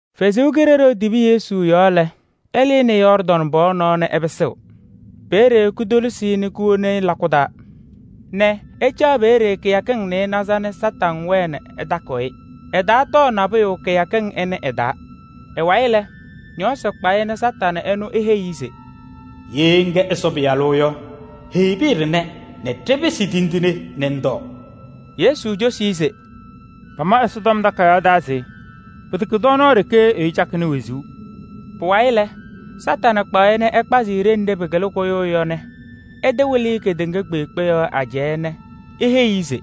Ɛsɔ Kalɩzaɣ tibi Yesu yɔɔ lɛ, ɛlɩnɩ Yɔɔrdaŋ pɔɔ nɔɔ nɛ ɛpɩsɩɣ. Peeye kotolisi-i nɛ kowoni-i lakʋ taa nɛ ɛcaɣ peeye kɩyakɩŋ nɩɩnaza nɛ Kañadʋ Satanɩ wɛɛ ɛtakɩɣ-ɩ. Ɛtaatɔɔ nabʋyʋ kɩyakɩŋ ɩnʋ ɩ-taa. Ɩ-wayɩ lɛ, ñɔɔsɩ kpa-ɩ nɛ Kañadʋ ɛnʋ eheyi-i se: “Ye ŋkɛ Ɛsɔ Pɩyalʋ yɔ, heyi pɩyɛ ɖɩnɛ nɛ ɖɩpɩsɩ tindine nɛ ŋtɔɔ.” Yesu cosi-i se: “Pama Ɛsɔtɔm Takayaɣ taa se pɩtɛkɛ tɔɔnaɣ ɖeke ɛyʋ cakɩnɩ wezuu.” Pʋwayɩ lɛ, Kañadʋ Satanɩ kpaɣ-ɩ nɛ ɛkpazɩ-ɩ ɖenɖe pɩkɩlɩ kʋyʋʋ yɔ nɛ ɛtɩwɩlɩ-ɩ kedeŋa kpeekpe yɔɔ ajɛɛ nɛ eheyi-i se: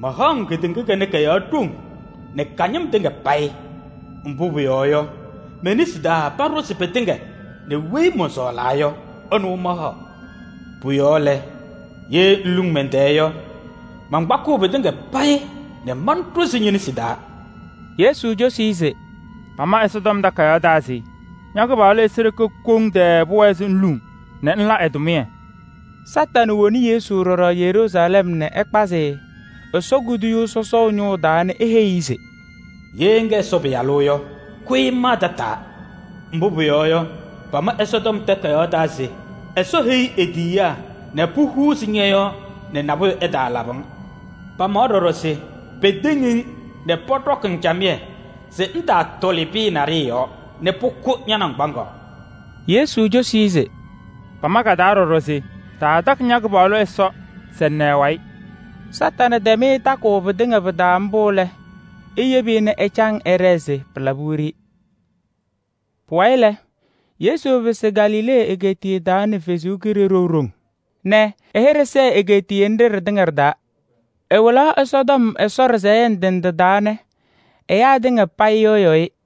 “Mahaɣ-ŋ kedeŋa kanɛ kɔ-yɔɔ ɖoŋ nɛ ka-ñɩm tɩŋa payɩ. Mbʋ pʋyɔɔ yɔ, me-nesi taa paɖʋzɩ pɩtɩŋa nɛ weyi mɔnsɔɔlaa yɔ, ɛnʋ mahaɣ. Pʋ-yɔɔ lɛ, ye ŋluŋ mɛn-tɛɛ yɔ, mankpakɩɣ pɩtɩŋa payɩ nɛ manɖʋzɩ ñe-nesi taa.” Yesu cosi-i se: “Pama Ɛsɔtɔm Takayaɣ taa se: ‘Ña-Kɩpaɣlʋ Ɛsɔ ɖeke koŋ tɛɛ pʋwɛɛ se ŋluŋ nɛ ŋla ɛ-tʋmɩyɛ.’” Kañadʋ Satanɩ woni Yesu ɖɔɖɔ Yeruusalɛm nɛ ɛkpazɩ-ɩ Ɛsɔ kuduyuu sɔsɔʋ ñʋʋ taa nɛ eheyi-i se: “Ye ŋkɛ Ɛsɔ Pɩyalʋ yɔ, kʋyɩ ŋmaa tataa. Mbʋ pʋyɔɔ yɔ, pama Ɛsɔtɔm Takayaɣ taa se Ɛsɔ heyiɣ e-tiyiyaa nɛ pohuuzi ñɔ-yɔɔ nɛ nabʋyʋ ɛtaalabɩ-ŋ. Pamawa ɖɔɖɔ se peteŋ-ŋ nɛ pɔɖɔkɩ-ŋ camɩyɛ se ŋtaatɔlɩ pɩyɛ naɖɩyɛ yɔɔ nɛ pʋkʋ ña-naŋgbaŋaɣ.” Yesu cosi-i se: “Pama ka-taa ɖɔɖɔ se taatakɩ ña-Kɩpaɣlʋ Ɛsɔ se ŋna ɛ-wayɩ.” Kañadʋ Satanɩ tɛm-ɩ takʋʋ pɩtɩŋa pɩ-taa mbʋ lɛ, eyebi-i nɛ ɛcaŋ ɛɖɛɛ se pɩɩlabɩnɩ wiɖiyi. Pʋwayɩ lɛ, Yesu pɩsɩ Galilee egeetiye taa nɛ Ɛsɔ Kalɩzaɣ ɖoŋ nɛ ɛ-hɩɖɛ sɛɛ egeetiye nɖɩ ɖɩtɩŋa ɖɩ-taa. Ɛwɩlaɣ Ɛsɔtɔm Ɛsɔ ɖɩsɛyɛ ndɩ ndɩ taa nɛ ɛyaa tɩŋa payɩ yɩɣyɩɣ-ɩ.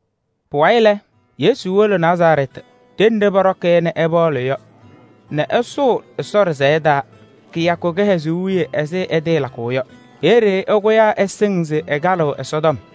Pʋwayɩ lɛ, Yesu wolo Nazarɛɛtɩ ɖenɖe pɔɖɔkɩ-ɩ nɛ ɛpaɣlɩ yɔ nɛ ɛsʋʋ Ɛsɔ ɖɩsɛyɛ taa kɩyakʋ kɩhɛzʋʋ wiye ɛzɩ ɛtɩɩlakʋʋ yɔ. Peeye ɛkʋyaa ɛsɩŋ se ɛkalɩɣ Ɛsɔtɔm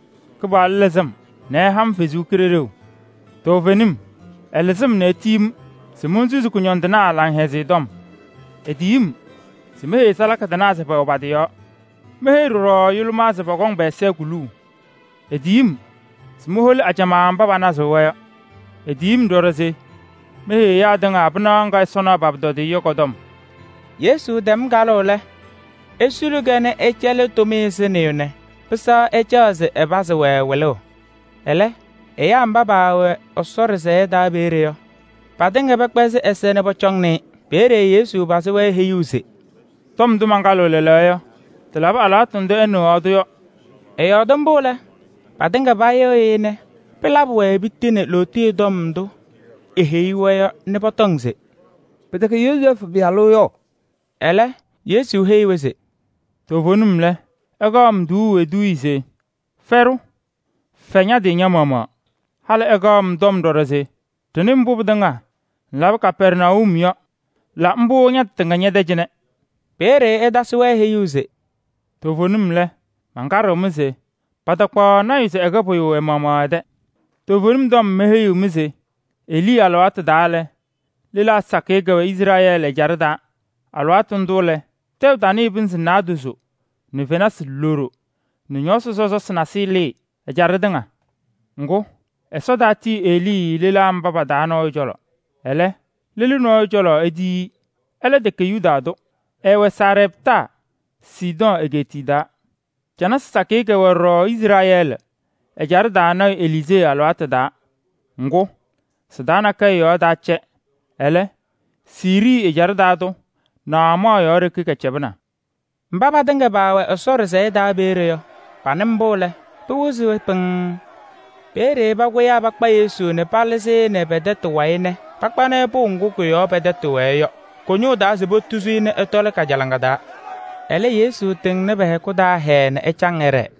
“Kɩpaɣlʋ lɩzɩ-m nɛ ɛha-m ɛ-Kalɩzaɣ nɛ etiyi-m se monsusi kʋñɔndɩnaa Laŋhɛzɩyɛ Tɔm nɛ meheyi salaka tɩnaa se pɔkɔŋ-wɛ lɩzʋʋ nɛ meheyi ɖɔɖɔ yʋlʋmaa se pɔkɔŋ pɛ-ɛza kuluu nɛ moholi mba panazɩɣ-wɛ yɔ. Etiyi-m ɖɔɖɔ se meheyi ɛyaa tɩŋa pɩnaɣ ŋga Ɛsɔ naɣ pa-pʋtɔdɩyɛ yɔ kɔ-tɔm.” Yesu tɛm kalʋʋ lɛ, esuli-kɛ nɛ ɛcɛlɩ tʋmɩyɛ sɩnɩyʋ nɛ pɩsɛɣ ɛcaɣ se ɛpazɩ-wɛ wɩlʋʋ. Ɛlɛ ɛyaa mba pɛwɛ Ɛsɔ ɖɩsɛyɛ taa peeye yɔ, patɩŋa pɛkpɛzɩ ɛza nɛ pɔcɔŋnɩ-ɩ. Peeye Yesu pazɩ-wɛ heyuu se: “Tɔm ndʋ mankalɩ lɛɛlɛɛyɔ yɔ, tɩlabɩ alɩwaatʋ ndʋ ɩnɩɣaɣ-tʋ yɔ.” Ɛyɔɔdɩ mbʋ lɛ, patɩŋa payɩɣyɩ-ɩ nɛ pɩlabɩ-wɛ piti nɛ lootiye tɔm ndʋ eheyi-wɛ yɔ nɛ pɔtɔŋ se: “Pɩtɛkɛ Yozɛɛfʋ pɩyalʋ yɔ?” Ɛlɛ Yesu heyi-wɛ se: “Toovenim lɛ, ɩkaɣ-m tuuu eduuye se: ‘Fɛɖʋ, fɛ ña-tɩ ña-maɣmaɣ.’ Halɩ ɩkaɣ-m tɔm ɖɔɖɔ se: ‘Ɖɩnɩ mbʋ pɩtɩŋa ŋlabɩ Kapɛrnayum yɔ, la mbʋ ña-tɩ tɩŋa ñɛ-tɛ cɩnɛ.’” Peeye ɛtasɩ-wɛ heyuu se: “Toovenim lɛ, mankaɖɩɣ-mɩ se patakpaɣ lɔɔyaɣ tʋ se ɛkɛ pʋyʋ ɛ-maɣmaɣ ɛ-tɛ. Toovenim tɔm meheyiɣ-mɩ se Elii alɩwaatʋ taa lɛ, lelaa sakɩyɛ kɛwɛ Izrɛɛlɩ ɛjaɖɛ taa. Alɩwaatʋ ndʋ lɛ, tɛʋ tanɩɩ pɩnzɩ naadozo nɛ fenasɩ loɖo nɛ ñɔɔsɩ sɔsɔsɩ nasɩyɩ lɩɩ ɛjaɖɛ tɩŋa. Ŋgʋ, Ɛsɔ taatiyi Elii lelaa mba pa-taa nɔɔyʋ cɔlɔ. Ɛlɛ, lelu nɔɔyʋ cɔlɔ etiyi-i. Ɛlɛ tɛkɛ Yuda tʋ, ɛɛwɛ Sarɛptaa, Sidɔɔ egeetiye taa. Canasɩ sakɩyɛ kɛwɛ ɖɔɖɔ Izrɛɛlɩ ɛjaɖɛ taa lɔɔyaɣ tʋ Eliizee alɩwaatʋ taa. Ŋgʋ, sɩ-taa nakɛyɛ yɔɔ taacɛ, ɛlɛ, Siirii ɛjaɖɛ taa tʋ Naamaɣ yɔɔ ɖeke kɛcɛbɩna.” Mba patɩŋa paawɛ Ɛsɔ ɖɩsɛyɛ taa peeye yɔ, panɩ mbʋ lɛ, pɩwɩzɩ-wɛ pɩŋŋ. Peeye pakʋyaa pakpa Yesu nɛ palɩzɩ-ɩ nɛ pɛ-tɛtʋ wayɩ nɛ pakpanɩ-ɩ pʋʋ ŋgʋ kʋ-yɔɔ pɛ-tɛtʋ wɛɛ yɔ kʋ-ñʋʋ taa se potuzi-i nɛ ɛtɔlɩ kajalaŋa taa. Ɛlɛ, Yesu tɩŋnɩ pɛ-hɛkʋ taa hɛɛɛ nɛ ɛcaŋ ɛɖɛɛ.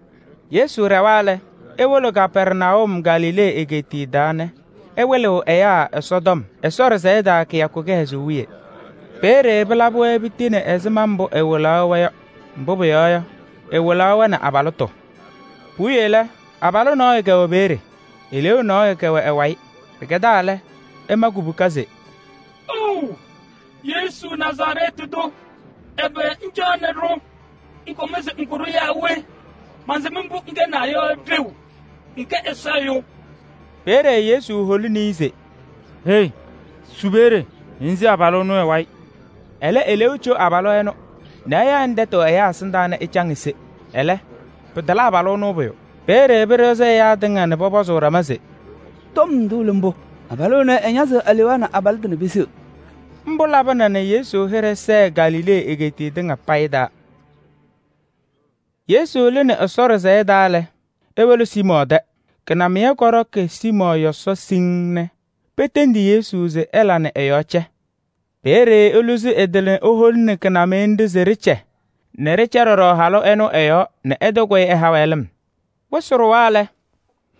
Yesu ɖɛwa lɛ, ewolo Kapɛrnayum Galilee egeetiye taa nɛ ɛwɩlɩɣ ɛyaa Ɛsɔtɔm Ɛsɔ ɖɩsɛyɛ taa kɩyakʋ kɩhɛzʋʋ wiye. Peeye pɩlabɩ-wɛ piti nɛ ɛzɩma mbʋ ɛwɩlaɣ-wɛ yɔ, mbʋ pʋyɔɔ yɔ, ɛwɩlaɣ-wɛ nɛ abalɩtʋ. Puwiye lɛ, abalʋ nɔɔyʋ kɛwɛ peeye, eleeu nɔɔyʋ kɛwɛ ɛ-wayɩ. Pɩkɛdaa lɛ, ɛma kubuka se: “Ou! Yesu Nazarɛɛtɩ tʋ, ɛbɛ ŋcaɣnɩ-ɖʋ? Ŋkɔm se ŋkʋ-ɖʋ yaa we? Mansɩm mbʋ ŋkɛnaa yɔ ɖeu. Ŋkɛ Ɛsɔ Ɛyʋ.” Peeye Yesu holini-i se: “Hei! Su peeye nɛ ŋse abalʋ ɛnʋ ɛ-wayɩ. Ɛlɛ eleeu co abalʋ ɛnʋ nɛ ɛyaɣ-ɩ nɛ tɛtʋ ɛyaa ɛsɩndaa nɛ ɛcaŋ ese. Ɛlɛ, pɩtala abalʋ ɛnʋ pʋyʋ.” Peeye pɩɖɩɣzɩ ɛyaa tɩŋa nɛ pɔpɔzʋʋ ɖama se: “Tɔm ndʋ lɛ mbʋ? Abalʋ ɛnɛ, ɛñazɩɣ alewaa nɛ abalɩtʋ nɛ peseɣ.” Mbʋ labɩna nɛ Yesu hɩɖɛ sɛɛ Galilee egeetiye tɩŋa payɩ taa. Yesu lɩnɩ Ɛsɔ ɖɩsɛyɛ taa lɛ, ewolo Siimɔɔ tɛ. Kɩnamɩyɛ kɔɖɔkɩ Siimɔɔ yɔsɔ siŋŋ nɛ petendi Yesu se ɛla nɛ ɛ-yɔɔ cɛ. Peeye Eluzi ɛ-tɩ nɛ eholini kɩnamɩyɛ nɖɩ se ɖɩcɛ nɛ ɖɩcɛ ɖɔɖɔ halʋ ɛnʋ ɛ-yɔɔ nɛ ɛtɩkʋyɩ ɛha-wɛ lɩm. Wɩsɩ ɖʋwa lɛ,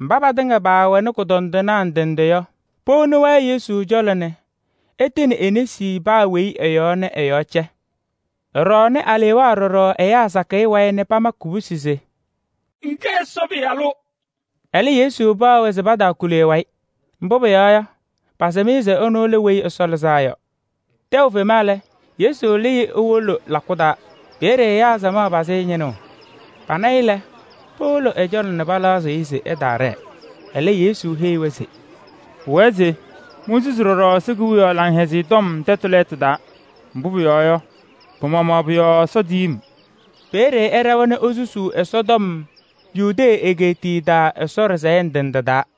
mba patɩŋa paawɛnɩ kʋdɔndɩnaa ndɩ ndɩ yɔ, powoni-wɛ Yesu cɔlɔ nɛ ɛtɩnɩ e-nesi paa weyi ɛ-yɔɔ nɛ ɛ-yɔɔ cɛ. Ɛɖɔɔnɩ alewaa ɖɔɖɔ ɛyaa sakɩyɛ wayɩ nɛ pamakɩ kubusi se: “Ŋkɛ Ɛsɔ Pɩyalʋ.” Ɛlɛ, Yesu paɣ-wɛ se pataakuli ɛ-wayɩ. Mbʋ pʋyɔɔ yɔ, pasɩm-ɩ se ɛnʋ lɛ Weyi Ɛsɔ Lɩzaa Yɔ. Tɛʋ tɩfema lɛ, Yesu lɩɩ ewolo lakʋ taa. Peeye ɛyaa samaɣ pazɩ-ɩ ñɩnʋʋ. Pana-ɩ lɛ, powolo ɛ-cɔlɔ nɛ palaɣzɩɣ-ɩ se ɛtaaɖɛɛ. Ɛlɛ, Yesu heyi-wɛ se: “Pʋwɛɛ se monsusi ɖɔɖɔ Ɛsɔ Kewiyaɣ Laŋhɛzɩyɛ Tɔm tɛtʋ lɛɛtʋ taa. Mbʋ pʋyɔɔ yɔ, pɩ-maɣmaɣ pʋ-yɔɔ Ɛsɔ tiyi-m.” Peeye ɛɖɛwa nɛ esusuu Ɛsɔtɔm Yudee egeetiye taa Ɛsɔ ɖɩsɛyɛ ndɩ ndɩ taa.